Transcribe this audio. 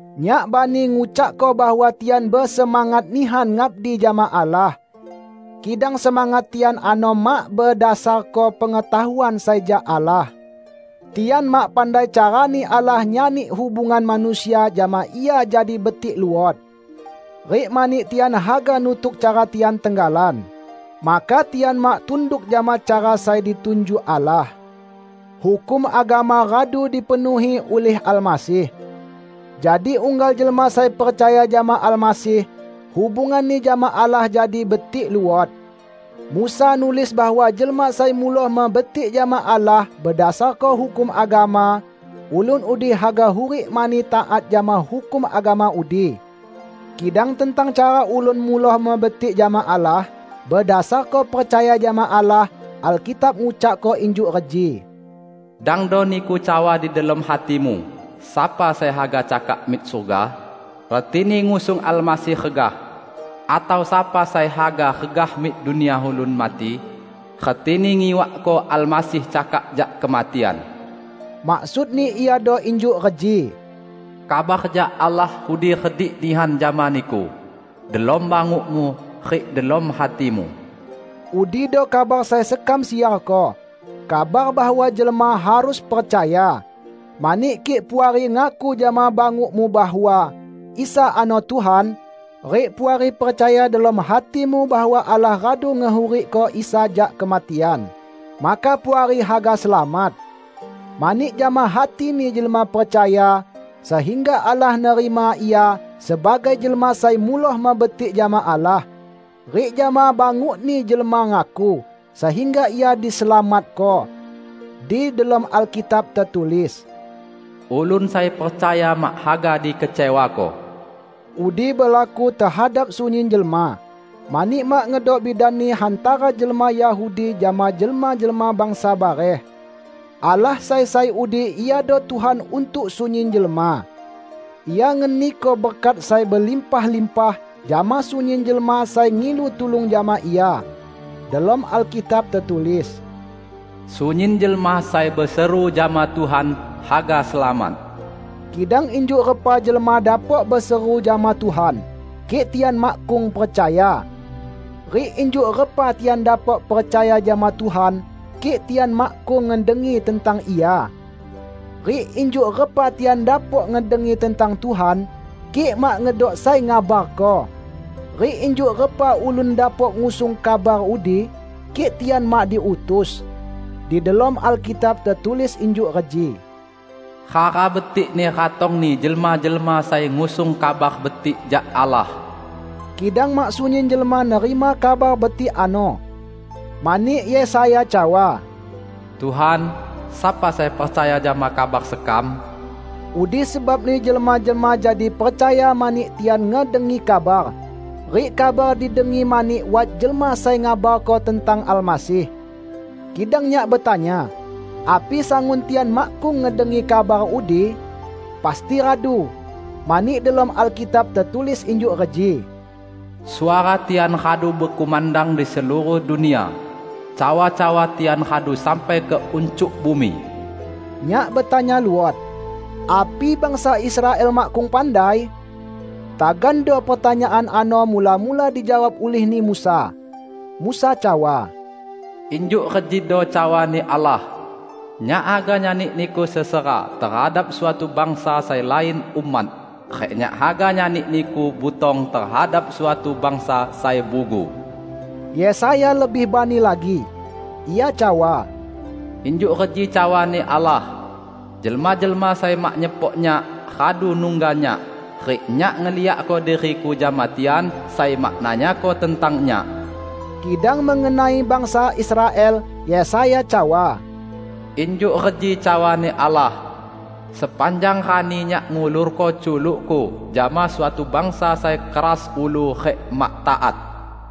Nyak bani ngucakko bahwa tian besemangat nihan ngabdi jama Allah. Kidang semangat tian ano mak bedasarko pengetahuan sai jak Allah. Tian mak pandai carani Allah nyani hubungan manusia jama Ia jadi betik luot. Rik mani tian haga nutuk cara tian tenggalan, maka tian mak tunduk jama cara sai ditunjuk Allah. Hukum agama radu dipenuhi ulih Almasih. Jadi unggal jelma sai percaya jama Almasih, hubunganni jama Allah jadi betik luot. Musa nulis bahwa jelma sai muloh mebetik jama Allah bedasarko hukum agama, ulun udi haga hurik mani taat jama hukum agama udi. Kidang tentang cara ulun muloh mebetik jama Allah bedasarko percaya jama Allah, Alkitab ngucakko injuk reji, "Dangdo niku cawa di delom hatimu, 'Sapa sai haga cakak mik surga?' (retini ngusung Almasih regah), atau, 'Sapa sai haga regah mik dunia ulun mati?' (retini ngiwakko Almasih cakak jak kematian)." Maksudni iado injuk reji, "Kabar jak Allah udi redik nihan jama niku; delom bangukmu rik delom hatimu." Udido kabar sai sekam siarko; kabar bahwa jelma harus percaya. Mani kik Puari ngaku jama bangukmu bahwa "Isa ano Tuhan", rik Puari percaya delom hatimu bahwa Allah radu ngehurikko Isa jak kematian, maka Puari haga selamat. Mani jama hatini jelma percaya, sehingga Allah nerima ia sebagai jelma sai muloh mebetik jama Allah. Rik jama bangukni jelma ngaku, sehingga ia diselamatko. Di delom Alkitab tetulis, "Ulun sai percaya mak haga dikecewako." Udi belaku tehadap sunyin jelma, mani mak ngedok bidani hantara jelma Yahudi jama jelma-jelma bangsa bareh. Allah sai sai udi iado Tuhan untuk sunyin jelma. Ia ngeniko berkat sai belimpah-limpah jama sunyin jelma sai ngilu tulung jama Ia. Delom Alkitab tetulis, "Sunyin jelma sai beseru jama Tuhan, haga selamat." Kidang injuk repa jelma dapok beseru jama Tuhan kik tian makkung percaya? Rik injuk repa tian dapok percaya jama Tuhan kik tian makkung ngedengi tentang Ia? Rik injuk repa tian dapok ngedengi tentang Tuhan, kik mak ngedok sai ngabarko? Rik injuk repa ulun dapok ngusung kabar udi kik tian mak diutus? Di delom Alkitab tetulis injuk reji, "Hara betikni ratongni jelma-jelma sai ngusung Kabar Betik jak Allah!" Kidang mak sunyin jelma nerima Kabar Betik ano. Mani Yesaya cawa, "Tuhan, sapa sai percaya jama kabar sekam?" Udi sebabni jelma-jelma jadi percaya mani tian ngedengi kabar, rik kabar didengi mani wat jelma sai ngabarko tentang Almasih. Kidang nyak betanya: Api sangun tian makkung ngedengi kabar udi? Pasti radu! Mani delom Alkitab tetulis injuk reji, "Suara tian radu bekumandang di seluruh dunia, cawa-cawa tian radu sampai ke uncuk bumi." Nyak betanya luot: Api bangsa Israel makkung pandai? Tagando pertanyaan ano mula-mula dijawab ulihni Musa. Musa cawa, "Injuk rejido cawa-Ni Allah, 'Nyak haga nyani niku sesera tehadap suatu bangsa sai lain umat rik Nyak haga nyani niku butong tehadap suatu bangsa sai bugu.' " Yesaya lebih bani lagi. Ia cawa, "Injuk reji cawa-Ni Allah, 'Jelma-jelma sai mak nyepok Nyak, radu nungga Nyak; rik Nyak ngeliakko diri-Ku jama tian sai mak nanyako tentang Nyak.' " Kidang mengenai bangsa Israel Yesaya cawa, "Injuk reji cawa-Ni Allah, 'Sepanjang rani Nyak ngulorko culuk-Ku jama suatu bangsa sai keras ulu rik mak taat.' "